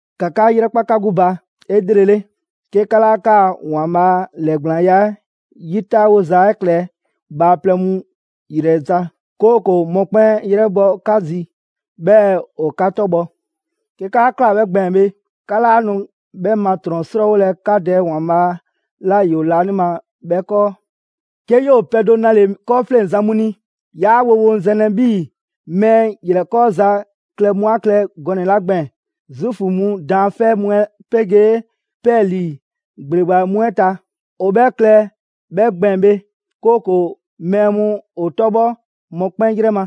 «‑Ka 'ka 'yrɛkpa 'ka 'gbu ba 'elrele, 'ke 'ka 'laa 'kaa‑ ‑Waanbhaa' ‑lɛɛgblaanya 'ɛ 'yi 'taawoza 'ɛ klɛ bhaaplɛŋ mu ‑yrɛ ta, 'kooko‑ mɔkpɛn' 'yrɛbhɔ 'ka zi, 'bhɛɛ‑ ‑o 'ka 'tɔbhɔ. 'Ke 'kaa ꞊kla 'bhɛ gbɛɛn‑ bhe, 'ka 'laa nu 'bhɛ ma 'trɔn‑ ‑srɔɔwolɛ 'ka Dɛ ‑Waanbhaa' 'la ‑yoo laanima 'bhɛ 'kɔɔ.» «'Ke 'yoo‑ pɛ do 'nale‑ 'kɔɔfleŋzan mu ni, 'yaa woŋwoŋzɛnlɛ 'bhii‑ mɛɛ ‑yrɛkɔɔza klɛ mu a klɛ gɔnɛ‑ 'la gbɛɛn‑ Zuufu mu daanfɛ' mu 'ɛ 'pegee 'pɛɛlii‑ ‑gbleba mu 'ɛ ta. ‑O 'bhɛ klɛ 'bhɛ gbɛɛn‑ bhe, 'kooko‑ mɛɛ mu ‑o 'tɔbhɔ mɔkpɛn' 'yrɛ ma.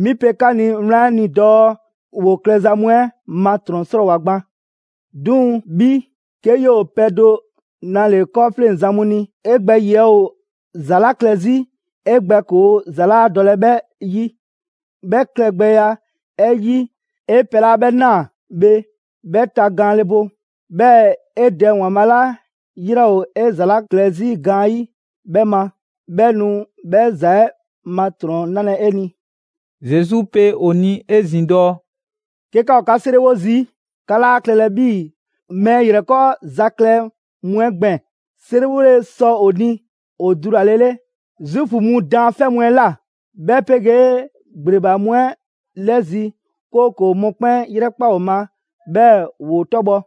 'Mi pe 'ka ni wlan 'ɛ ni dɔɔ ‑woo klɛza mu 'ɛ ma ‑trɔn 'srɔɔwoa‑ gban. 'Duŋ‑ 'bhi, 'ke 'yoo‑ pɛ do 'nale‑ 'kɔɔfleŋzan mu ni, 'e gbɛ ‑yiɛ' ‑o ‑za 'la klɛ 'zi 'e gbɛ ‑koo' ‑za 'laa dɔlɛ 'bhɛ 'yi. 'Bhɛ klɛgbɛya 'ɛ 'yi, 'e pɛ 'la 'bhɛ 'naa‑ bhe, 'bhɛ tagaanle bo. 'Bhɛɛ‑ 'e Dɛ ‑Waanbhaa' 'la 'yrɛ ‑o 'e ‑za 'la klɛ 'zi gaanyi' 'bhɛ ma, 'bhɛ nu 'bhɛ ‑za 'ɛ ma ‑trɔn 'nalɛ‑ 'e ni.» Zesu pe ‑o ni 'ezin‑ dɔɔ: «'Ke 'ka ‑o 'ka 'seriwo zii', 'ka 'laa klɛlɛ 'bhii‑ mɛɛ ‑yrɛkɔɔza klɛ mu 'ɛ gbɛɛn‑: 'Seriwole sɔ ‑o ni ‑o dulalele Zuufu mu daanfɛ' mu 'ɛ ꞊la, 'bhɛ 'pegee ‑gbleba mu 'ɛ 'lɛzi‑, 'kooko‑ mɔkpɛn' 'yrɛkpa‑ ‑o ma, 'bhɛɛ‑ ‑woo 'tɔbhɔ‑.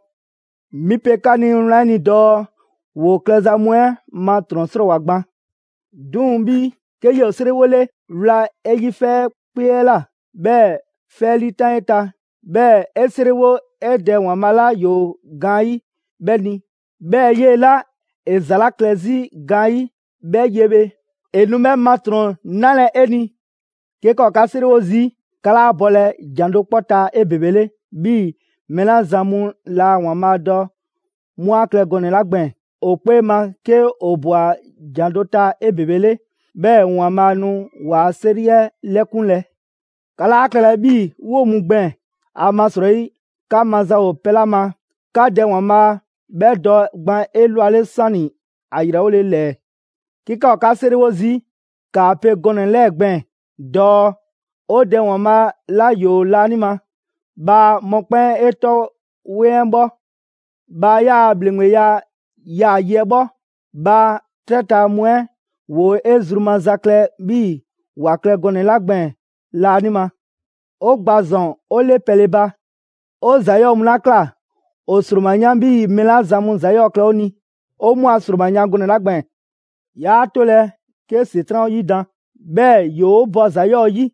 'Mi pe 'ka ni wlan 'ɛ ni dɔɔ ‑woo klɛza mu 'ɛ ma ‑trɔn 'srɔɔwoa‑ gban. 'Duŋ‑ 'bhi, 'ke 'yoo‑ 'e 'seriwole, wla 'e yi 'fɛkpee 'ɛ ꞊la, 'bhɛɛ‑ 'fɛ 'ɛ 'liitan 'e ta. 'Bhɛɛ‑ 'e 'seriwo 'e Dɛ ‑Waanbhaa' 'la ‑yoo gaanyi' 'bhɛ ni; 'bhɛɛ‑ 'yee‑ 'la 'e ‑za 'la klɛ 'zi gaanyi' 'bhɛ ye bhe, ‑e nu 'bhɛ ma ‑trɔn 'nalɛ‑ 'e ni.» «'Ke 'ka ‑o 'ka 'seriwo zii', 'ka 'laa bɔlɛ ‑jan do 'kpɔ ta 'ebebele 'bhii‑ mɛɛ 'la zan mu laa ‑Waanbhaa' dɔ 'mu 'a klɛ gɔnɛ‑ 'la gbɛɛn‑: ‑O 'kpee ma 'ke ‑o ꞊bwa ‑jan do ta 'ebebele, 'bhɛɛ‑ ‑Waanbhaa' nu ‑waa' 'seri 'ɛ 'lɛkunlɛ. 'Ka 'laa klɛlɛ 'bhii‑ 'woo‑ mu gbɛɛn‑. ‑Amasrɔyi 'ka maza ‑o pɛ 'la ma, 'ka Dɛ ‑Waanbhaa' 'bhɛ dɔ gban 'elwale 'sani‑ ‑a ‑yrɛwole ‑lɛɛ. 'Ke 'ka ‑o 'ka 'seriwo zii', ‑kaa pe gɔnɛ‑ 'lɛɛ‑ gbɛɛn‑ dɔɔ: ‹‑O Dɛ ‑Waanbhaa' 'la ‑yoo laanima, bhaa mɔkpɛn' 'e 'tɔ 'weŋ 'ɛ 'bhɔ. Bhaa 'yaa‑ ‑bhleŋgbeya 'yaa‑ yi 'ɛ 'bhɔ; bhaa 'trɛ ta mu 'ɛ ‑woo 'e zru maza klɛ 'bhii‑ ‑wa klɛ gɔnɛ‑ 'la gbɛɛn‑ laanima. 'O gba ‑zɔn 'o 'le pɛle ba. 'O ‑za 'yɔɔ‑ mu 'la ꞊kla, ‑o ‑sroma 'yan 'bhii‑ mɛɛ 'la zan mu ‑za 'yɔɔ‑ klɛ 'o ni, 'o 'mu a ‑sroma yan gɔnɛ‑ 'la gbɛɛn‑. 'Yaa 'tolɛ‑ 'ke ‑Setran' 'o 'yidan‑, 'bhɛɛ‑ ‑yoo 'o bɔ ‑za 'yɔɔ‑ 'yi.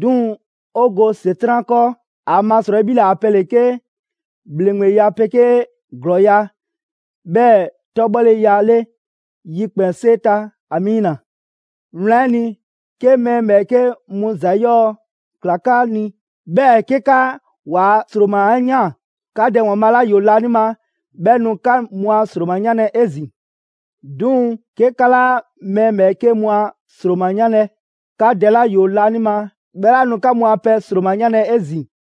'Duŋ‑ 'o go ‑Setran' 'kɔɔ. ‑Amasrɔyi 'bhi ‑le a pɛ ‑le 'ke ‑bhleŋgbeya 'pegee ‑glɔɔya', 'bhɛɛ‑ 'tɔbhɔleya 'le ‑yikpɛnsee ta. Amiina!› «Wlan 'ɛ ni, 'ke mɛɛ ‑bhɛɛke' mu ‑za 'yɔɔ‑ ꞊kla 'ka ni, 'bhɛɛ‑ 'ke 'ka ‑waa' ‑sroma 'ɛ ‑yaan, 'ka Dɛ ‑Waanbhaa' 'la ‑yoo laanima 'bhɛ nu 'ka mu a ‑sroma 'yanlɛ‑ 'ezin‑. 'Duŋ‑ 'ke 'ka 'laa mɛɛ ‑bhɛɛke' mu a ‑sroma 'yanlɛ‑, 'ka Dɛ 'la ‑yoo laanima 'bhɛ laa nu 'ka mu a pɛ ‑sroma 'ɛ 'yanlɛ‑ 'ezin‑.»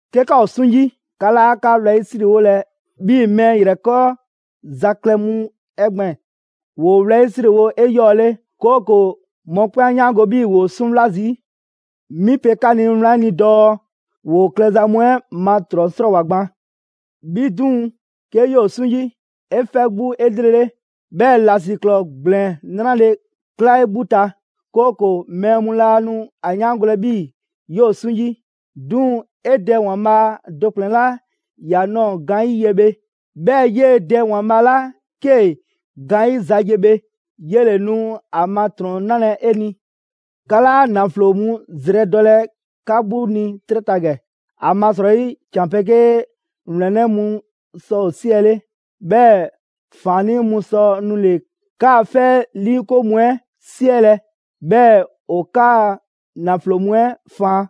«'Ke 'ka ‑o 'suŋ 'yi, 'ka 'laa 'ka wlɛyisriwolɛ 'bhii‑ mɛɛ ‑yrɛkɔɔza klɛ mu 'ɛ gbɛɛn‑: ‑Woo wlɛyisriwo 'eyɔɔle, 'kooko‑ mɔkpɛn' 'a 'yaango‑ 'bhii‑ ‑woo 'suŋwla zii'. 'Mi pe 'ka ni wlan 'ɛ ni dɔɔ ‑woo klɛza mu 'ɛ ma ‑trɔn ‑srɔɔwoa gban. 'Bhi 'duŋ‑, 'ke 'yoo‑ 'suŋ 'yi, 'e 'fɛ 'gbu 'elrele, 'bhɛɛ‑ ‑lasiklɔɔ ‑gblɛn 'nrale‑ 'kla 'e 'gbu ta, 'kooko‑ mɛɛ mu laa nu ‑a 'yaangolɛ 'bhii‑ 'yoo‑ 'suŋ 'yi. 'Duŋ‑ 'e Dɛ ‑Waanbhaa' do ‑kplɛn 'la ‑ya ꞊nɔɔ gaanyi' ye bhe, 'bhɛɛ‑ 'yee‑ Dɛ ‑Waanbhaa' 'la 'kee‑ gaanyiza ye bhe, 'yele‑ nu ‑a ma ‑trɔn 'nalɛ‑ 'e ni.» «'Ka 'laa ‑naflo mu zrɛdɔlɛ 'ka 'gbu ni 'trɛ ta ‑gɛ. ‑Amasrɔyi ‑can 'pegee ‑wlɛnnɛ' mu sɔ ‑o 'siɛle, 'bhɛɛ‑ ‑faannii' mu sɔ nule‑ 'kaa 'fɛ 'ɛ 'liikoŋ mu 'ɛ 'siɛlɛ‑ 'bhɛɛ‑ ‑o 'kaa‑ ‑naflo mu 'ɛ faan.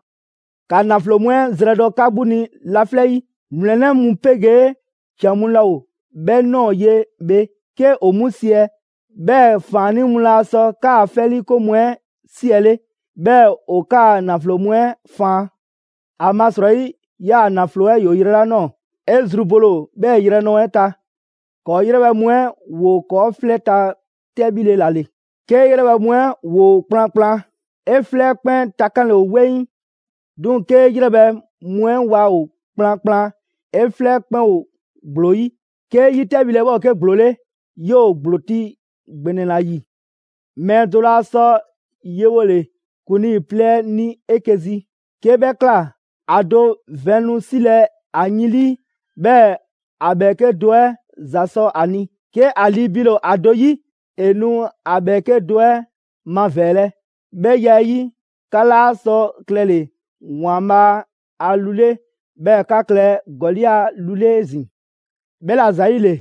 ‑Ka ‑naflo mu 'ɛ zrɛdɔ 'ka 'gbu ni laflɛ' 'yi; ‑wlɛnnɛ' mu 'pegee ‑can mu laa ‑o 'bhɛ ꞊nɔɔ ye bhe 'ke ‑o 'mu siɛ, 'bhɛɛ‑ ‑faannii' mu laa sɔ 'kaa‑ 'fɛ 'liikoŋ mu 'ɛ 'siɛle, 'bhɛɛ‑ ‑o 'kaa‑ ‑naflo mu 'ɛ faan. ‑Amasrɔyi 'yaa‑ ‑naflo 'ɛ ‑yoo yrɛ 'la ꞊nɔɔ, 'e zru bole ‑o 'bhɛɛ‑ yrɛ ꞊nɔɔ 'ɛ ta.» «‑Kɔɔ' 'yrɛbhɛ‑ mu 'ɛ ‑woo ‑kɔɔ' 'flɛ ta 'tɛbhile ‑la ‑le. 'Kee‑ 'yrɛbhɛ‑ mu 'ɛ ‑woo kplankplan, 'e 'flɛ 'ɛ 'kpɛn takanle ‑o 'weŋ. 'Duŋ‑ 'kee 'yrɛbhɛ‑ mu 'ɛ waa ‑o kplankplan, 'e 'flɛ 'kpɛn ‑o ‑gblo 'yi. 'Kee 'yi 'tɛbhile 'ɛ 'bhɛ ‑o 'ke ‑gblo 'le, 'yoo‑ ‑gblo ti ‑gbɛnɛ ‑la ‑yi.» «Mɛɛ do laa sɔ yewole ‑kuŋlii plɛ ni 'eke‑ zi. 'Kee‑ 'bhɛ ꞊kla, ‑a do vɛn nu 'silɛ‑ ‑a yin 'lii, 'bhɛɛ‑ ‑a ‑bhɛɛke' do 'ɛ ‑za sɔ a ni. 'Ke ‑a lii biile ‑o ‑a do 'yi, ‑e nu ‑a ‑bhɛɛke' do 'ɛ mavɛɛlɛ. 'Bhɛ ya 'ɛ 'yi, 'ka 'laa sɔ klɛle‑ ‑Waanbhaa' a lu 'le, 'bhɛɛ‑ 'ka klɛ ‑gɔli' a lu 'le 'ezin‑.» «'Bhɛla‑ ‑zayile,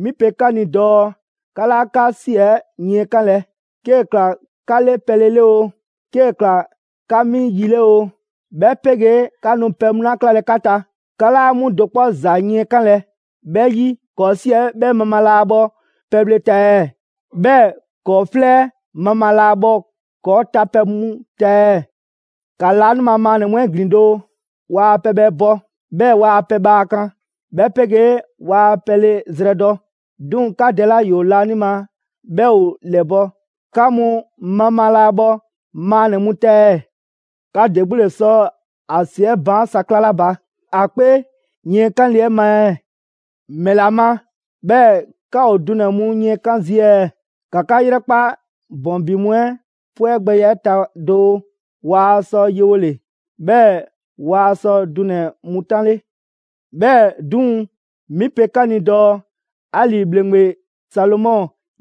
'mi pe 'ka ni dɔɔ 'ka 'laa 'ka 'si 'ɛ yiɛnkanlɛ: 'kee‑ ꞊kla 'ka 'le pɛle 'le oo, 'kee‑ ‑kla 'ka 'mi yi 'le oo, 'bhɛ 'pegee 'ka nu pɛ mu 'la 'klalɛ‑ 'ka ta, 'ka 'laa 'mu do 'kpɔ ‑za yiɛnkanlɛ. 'Bhɛ 'yi, ‑kɔɔ' ‑si 'ɛ 'bhɛ mabhaa laa bhɔ pɛbhle ta ɛɛ? 'Bhɛɛ‑ ‑kɔɔ' 'flɛ 'ɛ mabhaa laa bhɔ ‑kɔɔ' tapɛ mu ta ɛɛ? ‑Ka laanima maannɛ‑ mu 'ɛ ‑glin doo. Waa pɛbhɛ bɔ, 'bhɛɛ‑ waa pɛ bhaa kan; 'bhɛ 'pegee waa pɛle zrɛdɔ, 'duŋ‑ 'ka Dɛ 'la ‑yoo laanima 'bhɛ ‑o ‑lɛbɔ'. 'Ka mu mabhaa 'laa bhɔ maannɛ‑ mu ta ɛɛ? 'Ka ‑de 'gbu ‑le sɔ ‑a ‑si 'ɛ baan' sa 'klale 'a ba, ‑a 'kpee yiɛnkanle 'ɛ ma ɛɛ?» «‑Mɛla ma, 'bhɛɛ‑ 'ka ‑o dunɛ‑ mu yiɛnkan' zii' ɛɛ? ‑Ka 'ka 'yrɛkpa ‑bɔn ‑bi mu 'ɛ 'pwɛgbɛya 'ɛ ta doo: Waa sɔ yewole, 'bhɛɛ‑ waa sɔ dunɛ‑ mu 'tanle. 'Bhɛɛ‑ 'duŋ‑, 'mi pe 'ka ni dɔɔ: 'Ali‑ ‑bhleŋgbe Salomɔ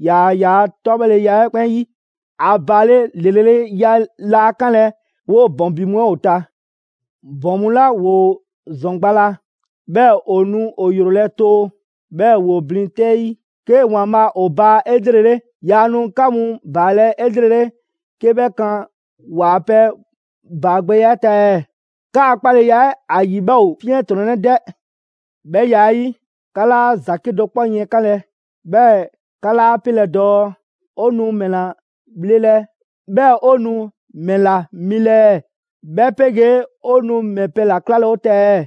‑yaa yaa 'tɔbhɔleya 'ɛ 'kpɛn 'yi, ‑a ‑baale' ‑lreleya laa 'kanlɛ‑ 'woo‑ ‑bɔn ‑bi mu 'ɛ ‑o ta. ‑Bɔn mu 'la ‑woo ‑zɔn gba la, 'bhɛɛ‑ ‑o nu ‑o ‑yrolɛ' too, 'bhɛɛ‑ ‑woo blin 'tɛ 'yi, 'ke ‑Waanbhaa' ‑o baa 'elrele; yaa nu 'ka mu ‑baalɛ' 'elrele 'ke 'bhɛ kan ‑waa' pɛ ‑baagbɛya 'ɛ ta ɛɛ? 'Kaa‑ 'kpaleya 'ɛ ‑a ‑yi 'bhɛ ‑o 'fiɛntrɔnnɛ 'dɛ! 'Bhɛ ya 'ɛ 'yi, 'ka 'laa ‑za 'kedo‑ 'kpɔ yiɛnkanlɛ, 'bhɛɛ‑ 'ka 'laa 'pelɛ‑ dɔɔ: ‹'O nu ‑mɛla bhlelɛ, 'bhɛɛ‑ 'o nu ‑mɛla milɛ ɛɛ? 'Bhɛ 'pegee 'o nu ‑mɛ pɛ ‑la 'klalɛ‑ 'o ta ɛɛ?›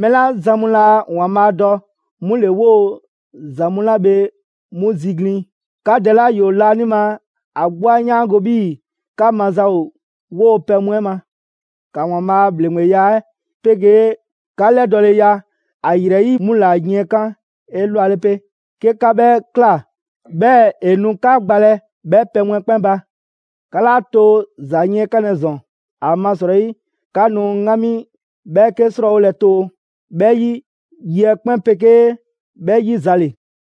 Mɛɛ 'la zan mu laa ‑Waanbhaa' dɔ, 'mu ‑le 'woo‑ ‑za mu 'la bhe 'mu ziglin. 'Ka Dɛ 'la ‑yoo laanima ‑a 'gbu 'a 'yaango‑ 'bhii‑ 'ka maza ‑o 'woo‑ pɛ mu 'ɛ ma. ‑Ka ‑Waanbhaa' a ‑bhleŋgbeya 'ɛ 'pegee 'ka 'lɛdɔɔleya ‑a ‑yrɛ 'yi 'mu ‑la yiɛnkan' 'elwale 'pe. 'Ke 'ka 'bhɛ ꞊kla, 'bhɛɛ‑ ‑e nu 'ka gbalɛ 'bhɛ pɛ mu 'ɛ 'kpɛn ba. 'Ka 'laa too ‑za yiɛnkanlɛ ‑zɔn. ‑Amasrɔyi 'ka nu 'ŋgami 'bhɛɛke 'srɔɔwolɛ too. 'Bhɛ 'yi, yi 'ɛ 'kpɛn 'pegee 'bhɛ 'yi za ‑le.»